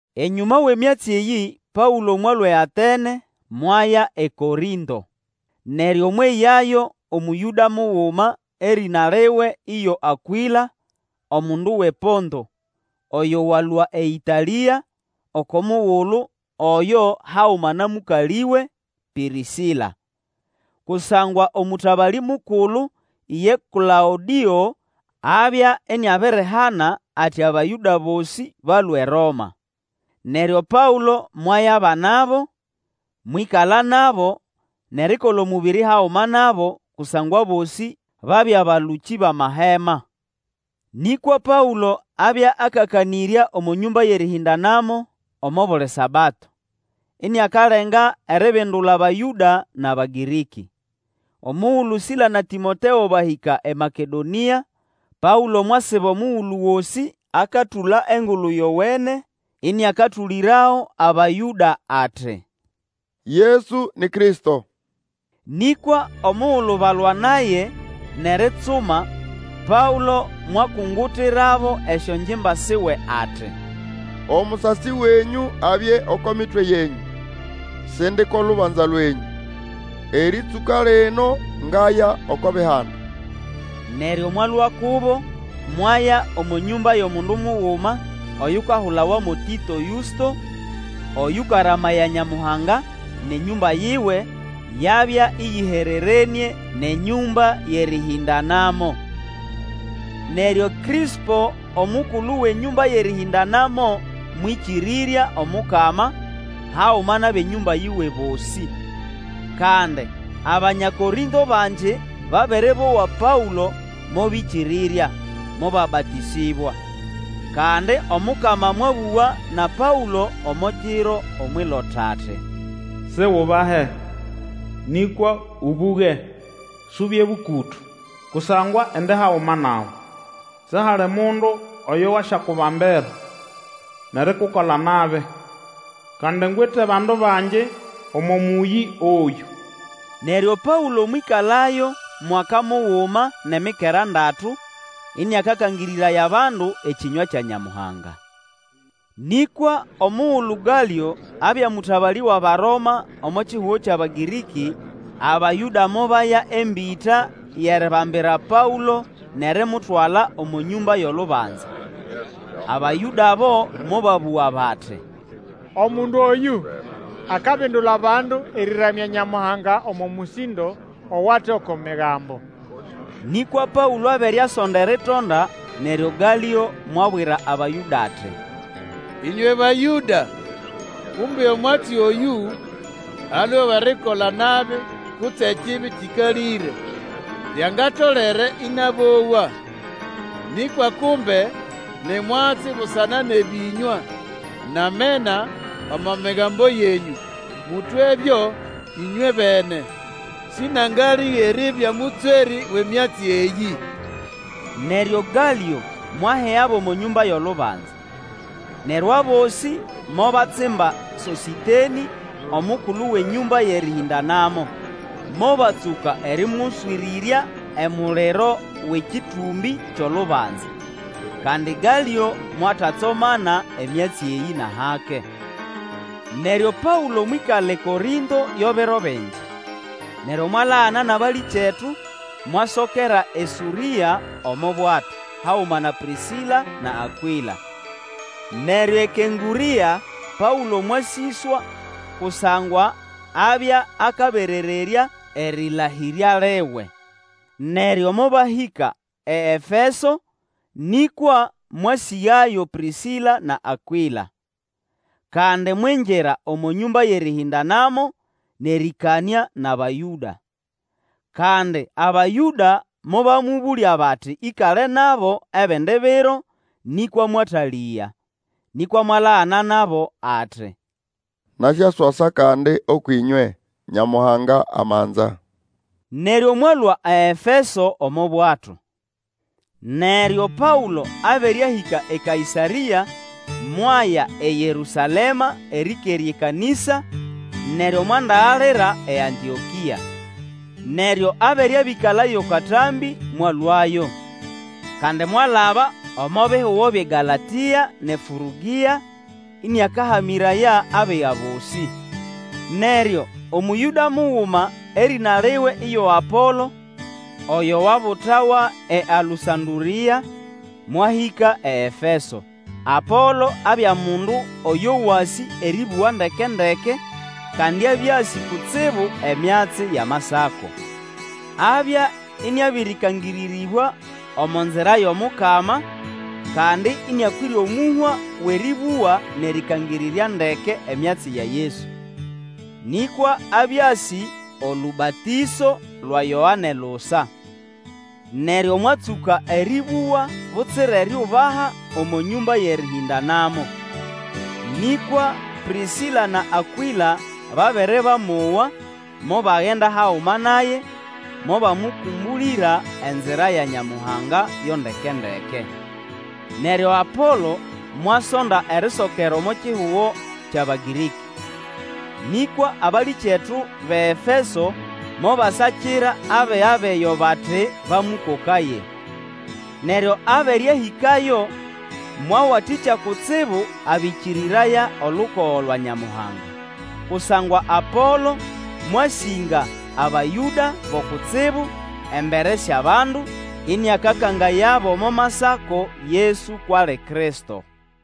Enyũma wʼemyatsi eyĩ Paũlo mwalũa eAtene, mwaya eKorĩnto. Neryo mweyayo Omũyũda muguma, erĩna liwe iyo Akwĩla, omundu wʼePonto, oyo walũa eĨtalĩa oko mugulu oyo haguma na mũkalĩwe, Pĩrĩsĩla. Kusangwa Omũtabalĩ mukulu ye Klaũdĩo abya iniabirihana ati Abayũda bosĩ balũe eRoma. Neryo Paũlo mwayabanabo, mwĩkala nabo, nʼerikola omũbĩrĩ haguma nabo, kusangwa abosĩ babya balũkĩ bʼamahema. Nĩkwa Paũlo abya akakanĩrya omo nyũmba yʼerĩhĩndanamo omo buli Sabato, iniakalenga eribindula Abayũda nʼAbagĩrĩkĩ. Omugulu Sila na Tĩmoteo bahĩka eMakedonĩa, Paũlo mwasiba omugulu gosĩ akatũla Engulu Yowene, ĩnĩakatũlĩrago Abayũda ati, Yesu ni Kristo. Nĩkwa omugulu balwa naye nʼeritsuma, Paũlo mwakungutirabo esyongimba siwe ati, Omusasi wenyũ abye oko mitwe yenyũ! Sindi ko lubanza lwenyũ. Erĩtsũka lino ngaya oko Bihanda. Neryo mwalũa kubo, mwaya omo nyũmba yʼomundu muguma oyukahulawa mo Tĩto Yũsto, oyũkaramaya Nyamuhanga, nʼenyũmba yiwe yabya ĩyĩhererenĩe nʼenyũmba yʼerĩhĩndanamo. Neryo Krĩspo, omukulu wʼenyũmba yʼerĩhĩndanamo, mwĩkĩrĩrya Omukama, haguma nʼabʼenyũmba yiwe bosĩ. Kandi Abanya Korĩnto bangi babere bowa Paũlo, mobĩkĩrĩrya, mobabatĩsĩbwa. Kandi Omukama mwabũga na Paũlo omo kiro omwʼilota ati, Sigubahe, nĩkwa ũbũge, subye bũkũtũ. Kusangwa indi haguma nawe. Sihali mundu oyo wasyakubambira, nʼerikukola nabi, kandi ngwite bandu bangi omo mũyĩ oyũ. Neryo Paũlo mwĩkalayo mwaka muguma nʼemikera ndatu, ĩnĩakakangĩrĩraya abandu ekĩnywa kya Nyamuhanga. Nĩkwa omugulu Galĩo abya mũtabalĩ wʼAbaroma omo kihugo kyʼAbagĩrĩkĩ, Abayũda mobaya embĩta yʼeribambira Paũlo nʼerimutwala omo nyũmba yʼolubanza. Abayũda abo mobabũga bati, Omundu oyũ akabindula bandu erĩramya Nyamuhanga omo mũsĩndo owate oko Migambo. Nĩkwa Paũlo abere akasonda eritonda, neryo Galĩo mwabwira Abayũda ati, Ĩnywe Bayũda kumbe omwatsi oyũ alwe wʼerikola nabi kutse ekibi kĩkalĩre, lyangatolere ĩnabowa. Nĩkwa kumbe ni mwatsi busana nʼebĩnywa nʼamena omo migambo yenyũ, mũtwebyo ĩnywebene. Sĩnangalĩga eribya mũtswerĩ wʼemyatsi eyĩ! Neryo Galĩo mwahigabo omo nyũmba yʼolubanza. Neryo abosĩ mobatsimba Sosĩtenĩ, omukulu wʼenyũmba yʼerĩhĩndanamo, mobatsũka erĩmũswĩrĩrya emuliro wʼekĩtũmbĩ kyʼolubanza. Kandi Galĩo mwatatsomana emyatsi eyĩ, nʼahake. Neryo Paũlo mwĩkala eKorĩnto yo biro bingi. Neryo mwalagana nʼabalĩkyetu, mwasokera eSũrĩa omo bwato, haguma na Pĩrĩsĩla na Akwĩla. Neryo eKenkũrĩa Paũlo mwasĩswa, kusangwa abya akaberererya erĩlahĩrya liwe. Neryo mobahĩka eEfeso, nĩkwa mwasĩgayo Pĩrĩsĩla na Akwĩla. Kandi mwingira omo nyũmba yʼerĩhĩndanamo, nʼerĩkanĩa nʼAbayũda. Kandi Abayũda mobamũbũlya bati ĩkale nabo ebindi biro, nĩkwa mwatalĩga. Nĩkwa mwalagana nabo ati, Nasyaswasa kandi ũkwʼĩnywe, Nyamuhanga amanza. Neryo mwalũa eEfeso omo bwato. Neryo Paũlo abere ahĩka eKaĩsarĩa, mwaya eYerũsalema erĩkerya ekanĩsa, neryo mwandagalira eAntĩokĩa. Neryo abere abĩkalayo katambĩ, mwalũayo. Kandi mwalaba omo bihugo byʼeGalatĩa nʼeFũrĩgĩa, mĩraya abiga bosĩ. Neryo Omũyũda muguma erĩna liwe iyo Apolo oyo wabutawa eAlũsandũrĩa, mwahĩka eEfeso. Apolo abya mundu oyo wasĩ erĩbũga ndeke-ndeke, kandi abya asĩ kutsibu emyatsi yʼAmasako. Abya ĩnĩabĩrĩkangĩrĩrĩbwa omo nzira yʼomukama, kandi ĩnĩakwĩre omũhwa wʼerĩbũga nʼerĩkangĩrĩrya ndeke emyatsi ya Yesu. Nĩkwa abya asĩ olũbatĩso lwa Yoane lusa. Neryo mwatsũka erĩbũga butsira eriubaha omo nyũmba yʼerĩhĩndanamo. Nĩkwa Pĩrĩsĩla na Akwĩla babere bamowa, mobagenda haguma naye, mobamũkũmbũlĩra enzira ya Nyamuhanga yo ndeke-ndeke. Neryo Apolo mwasonda erisokera omo kihugo kyʼAbagĩrĩkĩ. Nĩkwa abalĩkyetu bʼeEfeso mobasakira abiga bʼeyo bati bamũkokaye. Neryo abere ahĩkayo, mwawatĩkya kutsibu abĩkĩrĩraya olukogo lwa Nyamuhanga. Kusangwa Apolo mwasĩnga Abayũda bo kutsibu embere syʼabandu, ĩnĩakakangayabo omo Masako Yesu kwʼali Kristo.